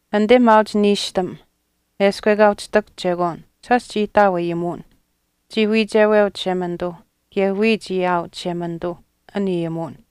Anite maauch niishtam, eshkw ekaa uhchi ihtakuhch chekwaan shaash chii ihtaau Ayimuwin. Chii wiicheweu Chishemanituu kaye wiya chii aau Chishemanituu an Ayimuwin.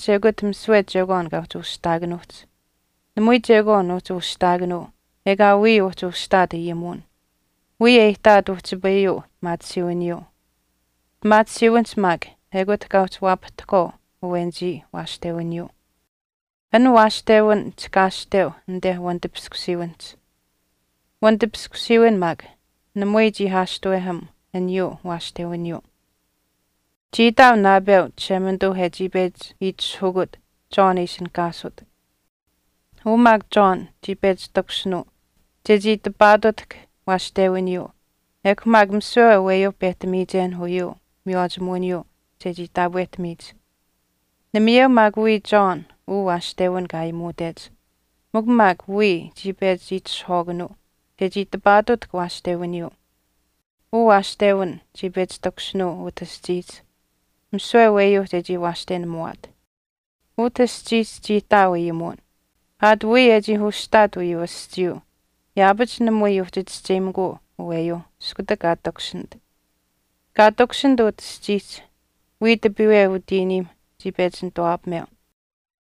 Ayimuwinihch ekut misiwe chekwaan kaa uhchi ushihtaakanuuhch. Namui chekwaan uhchi ushihtaakanuu ekaa wiya uhchi ushihtaat Ayimuwin. Wiya e ihtaat uhchipayuu pimaatisiiwiniyuu, pimaatisiiwinihch maak ekut kaa uhchi waapahtahkwaau awenichii waashtewiniyuu. An waashtewin chihkaashteu anite wanitipiskusiiwinihch, wanitipiskusiiwin maak namui chii aashtuweham aniyuu waashtewiniyuu. Chii ihtaau naapeu Chishemanituu e chii pechi itishahukut John e ishinihkaasut. Uu maak John chii pechi takushinuu chechii tipaatutahk waashtewiniyuu ekw maak misiwe aweyuu pehtamiyichenh uyuu miywaachimuwiniyuu chechii taapwehtamiyich. Namayeu maak wiya John uu waashtewin kaa aayimuutech mikw maak wiya chii pechi itishahwaakanuu chechii tipaatutahk waashtewiniyuu. Uu waashtewin chii pechi takushinuu utah aschiihch misiwe aweyuuh chechii waashtenamuwaat. Utah aschiihch chii ihtaau Ayimuwin. Aat wiya e chii ushihtaat uyuu aschiiyuu yaapach namui uhchi chischeyimikuu aweyuu iskutak kaa takushinit. Kaa takushinit utah aschiihch wiya tipiiwe utiiniimh chii pechi nituwaapameu,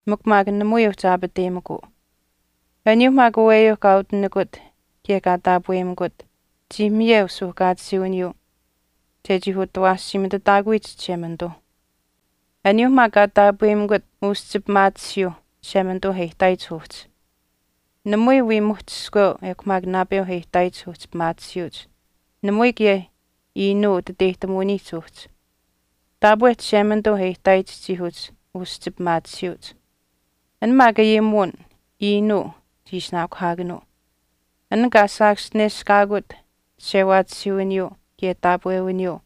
mikw maak namui uhchi aapateyimikuu. Aniyuu maak aweyuu kaa utinikut kaye kaa taapweyimikut chii miyeu suuhkaatisiiwiniyuu chechii utawaashiimitutaakuyich Chishemanituu. Aniyuuh maak kaa taapweyimikut uschi pimaatisiyuuh Chishemanituu e ihtaayich uhchi, namui wii muhch iskweu ekw maak naapeu e ihtaayich uhchi pimaatisiyuuch namui kaye iinuu utiteyihtamuwiniihch uhchi. Taapwe Chishemanituu e ihtaayich chii uhchi uschi pimaatisiyuuch. An maak Ayimuwin iinuu chii ishinaakuhaakanuu. An kaa saakaschineshkaakut chishewaatisiiwiniyuu kaye taapwewiniyuu,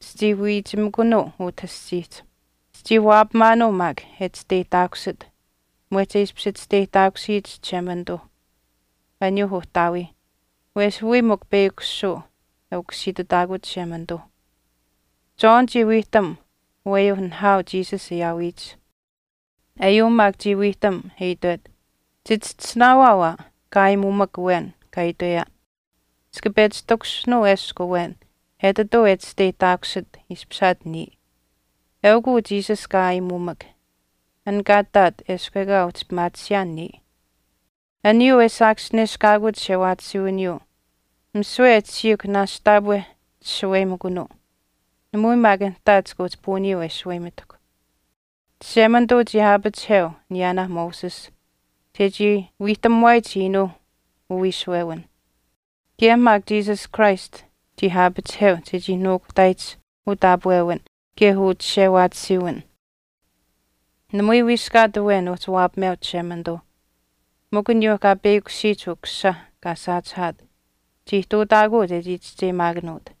chichii wiichimikunuu utah aschiihch. Chichii waapamaanuu maak e chisteyihtaakusit mwehch e ishpish chisteyihtaakusiyich Chishemanituuh aniyuuh Uhtaawiih wesh wiya mikw peyakushuu e Ukusiitutaakut Chishemanituu. John chii wiihtam aweyuu nihaau Jesus e aawiyich. Eyuu maak chii wiihtam e itwet, “Chichischisinaawaau aa kaa aayimuumak awen kaa itweyaan, ‘Chika pechi takushinuu eshkw awen etituu e chisteyihtaakusit ishpishaat niya. Eukw uu Jesus kaa aayimuumak an kaa ihtaat eshkw ekaa uhchi pimaatisiyaan niya.’” Aniyuu e saakaschineshkaakut chishewaatisiiwiniyuu misiwe e tashiihkw naashch taapwe chishaweyimikunuu, namui maak nihtaa chika uhchi puuniyuu e shaweyimitahkw. Chishemanituu chii aapachiheu aniyaanaa Moses chechii wiihtamuwaayich iinuuh uwiishuwewinh. Kaye maak Jesus Christ chii aapachiheu chechii nuukuhtaayich utaapwewin kaye uchishewaatisiiwin. Namui wiiskaat awen uhchi waapameu Chishemanituu, mikw aniyuu kaa peyakushiyich Ukusisa kaa saachihaat chii ihtuutaakuu chechii chischeyimaakanuut.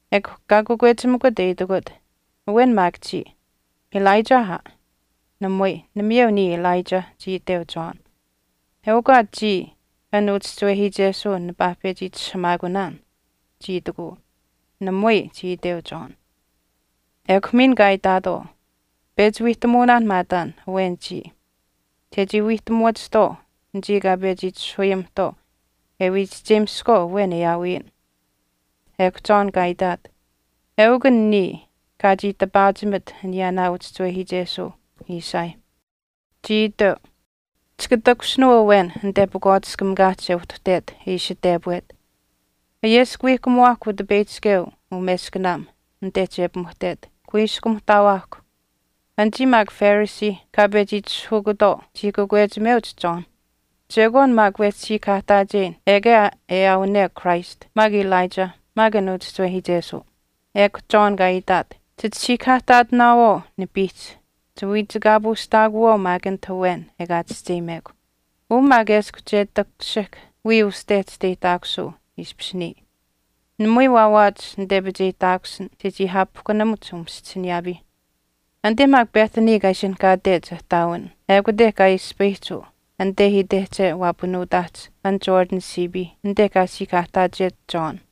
Ekw kaa kakwechimikut e itikut, “Awen maak chiya. Elijah aa.” “Namui. Namayeu niya Elijah,” chii iteu John. “Eukw aa chiya an uchischiwehiichesuu nipaa pechi itishahamaakunaan,” chii itikuu. “Namui,” chii iteu John. Ekw miin kaa itaatwaau, “Pechi wiihtamuunaan maataan awen chiya, chechii wiihtamuwachihtwaau anichii kaa pechi itishahuyimihtwaau e wii chischeyimiskwaau awen e aawiyin.” Ekw John kaa itwet, “Eukw an niya kaa chii tipaachimit aniyaanaa uchischiwehiichesuu Isaiah. Chii iteu, Chika takushinuu awen anite pakwaatiskamikaahch e uhtuhtet e ishi tepwet, Ayeskawiihkamuwaahkw Utipeyihchikeu umeskanaam anit che pimuhtet, kuiskumuhtaawaahkw.” Anichii maak Phariseeh kaa pechi itishahukutwaau chii kakwechimeuch John, “Chekwaan maak wehchi siikahaahtaacheyin ekaa e aawane Christ maak Elijah maak an uchischiwehiichesuu.” Ekw John kaa itaat, “Chit siikahaahtaatinaawaau nipiihch, chiwiichikaapuushtaakuwaau maak anit awen ekaa chischeyimekw. Uu maak eshkw che takushihk wiya uste chisteyihtaakusuu ishpish niya, namui waawaach nitepicheyihtaakusin chechii aapihkunamuch umaschisiniyaapiih.” Anite maak Bethany kaa ishinihkaatech ihtaawin ekute kaa ispayihch uu, anite itehche waapanuutaahch an Jordan siipii anite kaa siikahaahtaachet John.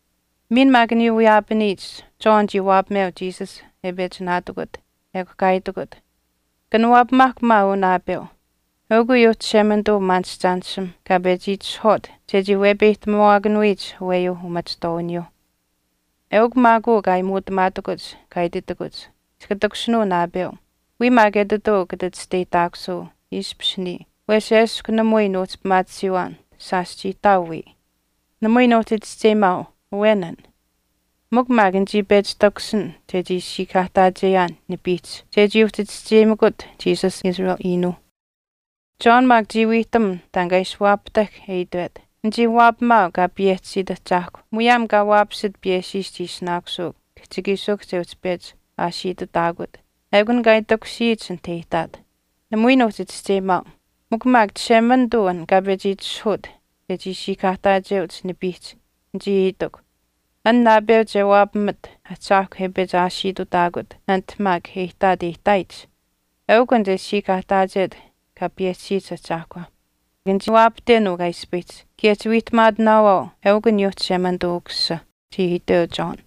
Miin maak aniyuu wiyaapaniyich John chii waapameu Jesus e pechi naatikut, ekw kaa itwet, “Kanawaapamaahkw maa uu naapeu, eukw uyuu Chishemanituu umaanishchaanishimh kaa pechi itishahwaat chechii wepeyihtamuwaakanuyich aweyuuh umachihtwaawiniyuuh. Eukw maak uu kaa aayimuutamaatakuch kaa ititakuch, ‘Chika takushinuu naapeu, wiya maak etituu kata chisteyihtaakusuu ishpish niya wesh eshkw namui nuuhchi pimaatisiiwaan shaash chii ihtaau wiya.’ Namui nuuhchi chischeyimaau awen an, mikw maak nichii pechi takushin chechii siikahaahtaacheyaan nipiihch chechii uhchi chischeyimakut Jesus Israel iinuuh.” John maak chii wiihtam taan kaa ishi waapahtahk e itwet, “Nichii waapamaau Kaa payehchisiit Ahchaahkw muyaam kaa waapasit piyeshiish chii ishinaakusuu kihchikiishikuhch e uhchi pechi aashiitutaakut, ekun kaa itakushiyich anit e ihtaat. Namui nuuhchi chischeyimaau, mikw maak Chishemanituu an kaa pechi itishahuut chechii siikahaahtaacheuch nipiihch, nichii itikw, ‘An naapeu che waapamat Ahchaahkw e pechi aashiitutaakut anit maak e ihtaat e ihtaayich, eukw an che siikahaahtaachet Kaa payehchisiyich Ahchaahkwa.’ Nichii waapahten uu kaa ispayihch kaye chiwiihtamaatinaawaau eukw aniyuu Chishemanituu Ukusisa,” chii iteu John.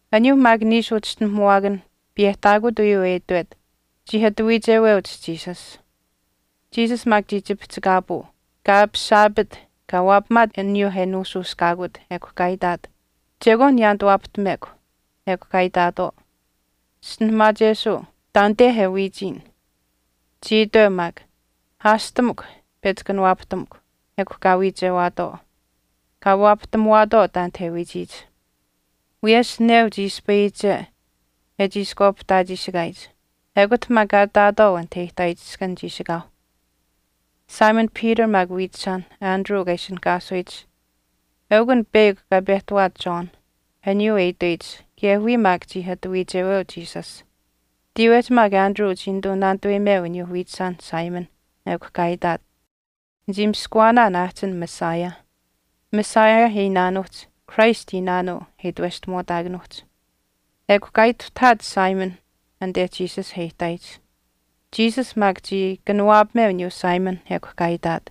Aniyuuh maak niishu uchischinuhamuwaakanh piyehtaakut uyuu e itwet, chii ati wiicheweuch Jesus. Jesus maak chii chipihchikaapuu, kaa aapisaapit kaa waapamaat aniyuu e nuushuushkaakut, ekw kaa itaat, “Chekwaan niyaanituwaapahtamekw.” Ekw kaa itaatwaau, “Chischinuhamaachesuu taanite e wiichiyin.” Chii iteu maak, “Aashtamukw pechi kanawaapahtamukw.” Ekw kaa wiichewaatwaau, kaa waapahtamuwaatwaau taanit e wiichiyich. Wiyesh neu chii ispayiyiche e chiishkwaapihtaachiishikaayich. Ekut maak kaa ihtaawaatwaau anit e ihtaayich iskan chiishikaauh. Simon Peter maak wiichishaanh, Andrew kaa ishinihkaasuyich eukw an peyakw kaa pehtawaat John aniyuu e itweyich kaye wiya maak chii ati wiicheweu Jesus. Tiiwehch maak Andrew chii nituu naanituweyimeu aniyuu wiichishaanh Simon ekw kaa itaat, “Nichii miskuwaanaan aahchin Messiah.” Messiah e iinaanuuhch Christ iinaanuu e itweshtamuwaataakanuuhch. Ekw kaa ituhtahaat Simon anite Jesus e ihtaayich. Jesus maak chii kanawaapameu aniyuu Simon ekw kaa itaat,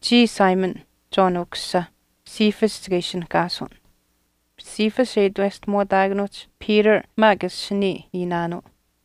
“chiya Simon, John ukusisa, Cephas chika ishinihkaasun.” Cephas e itweshtamuwaataakanuuhch Peter maak asinii iinaanuu.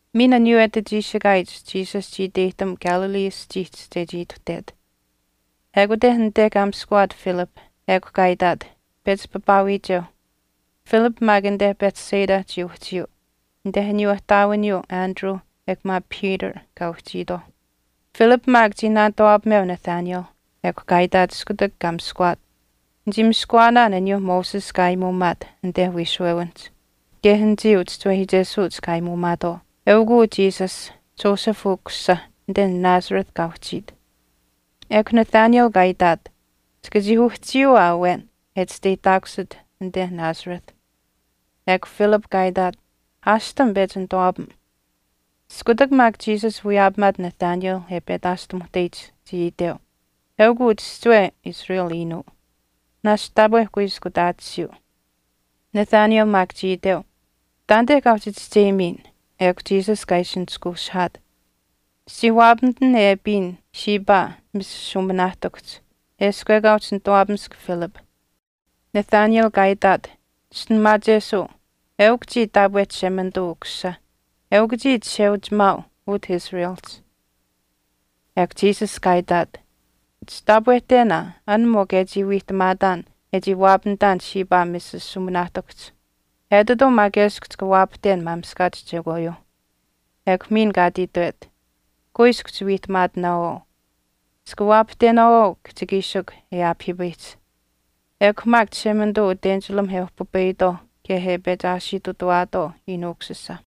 Miin aniyuu e ati chiishikaayich Jesus chii iteyihtam Galilee aschiihch chechii ituhtet. Ekute anite kaa miskuwaat Philip ekw kaa itaat, “Pechi papaawiicheu.” Philip maak anite Bethsaida chii uhchiyuu anite aniyuu ihtaawiniyuu Andrew ekw maak Peter kaa uhchiitwaau. Philip maak chii naanituwaapameu Nathanael ekw kaa itaat iskutak kaa miskuwaat, “Nichii miskuwaanaan aniyuu Moses kaa aayimuumaat anite wiishuwewinihch, kaye anichii uchischiwehiichesuuch kaa aayimuumaatwaau. Eukuu Jesus, Joseph ukusisa, anite Nazareth kaa uhchiit.” Ekw Nathanael kaa itaat, “Chika chii uhchiyuu aa awen e chisteyihtaakusit anite Nazareth.” Ekw Philip kaa itaat, “Aashtam pechi nituwaapam.” Iskutak maak Jesus wiyaapamaat Nathanael e petaashtamuhteyich chii iteu, “Eukuu chihchiwe Israel iinuu, naashch taapwe kuiskutaatisiyuu.” Nathanael maak chii iteu, “Taanite kaa uhchi chischeyimiyin.” Ekw Jesus kaa ishi nishkuushihaat, “Chichii waapamitin e apiyin shiipaa misishuuminaahtikuhch eshkw ekaa uhchi nituwaapamisk Philip.” Nathanael kaa itaat, “Chischinuhamaachesuu, eukw chii taapwe Chishemanituu Ukusisa, eukw chiya Chisheuchimaau utah Israelihch.” Ekw Jesus kaa itaat, “Chitaapwehten aa an mikw e chii wiihtamaataan e chii waapamitaan shiipaa misishuuminaahtikuhch. Etituu maak eshkw chika waapahten maamishkaach chekwaayuuh.” Ekw miin kaa ati itwet, “Kuiskw chiwiihtamaatinaawaau, chika waapahtenaawaau kihchikiishikw e aapahiipayihch, ekw maak Chishemanituu utenchilamh e uhpipayitwaau kaye e pechi aashiitutuwaatwaau Iinuu Ukusisa.”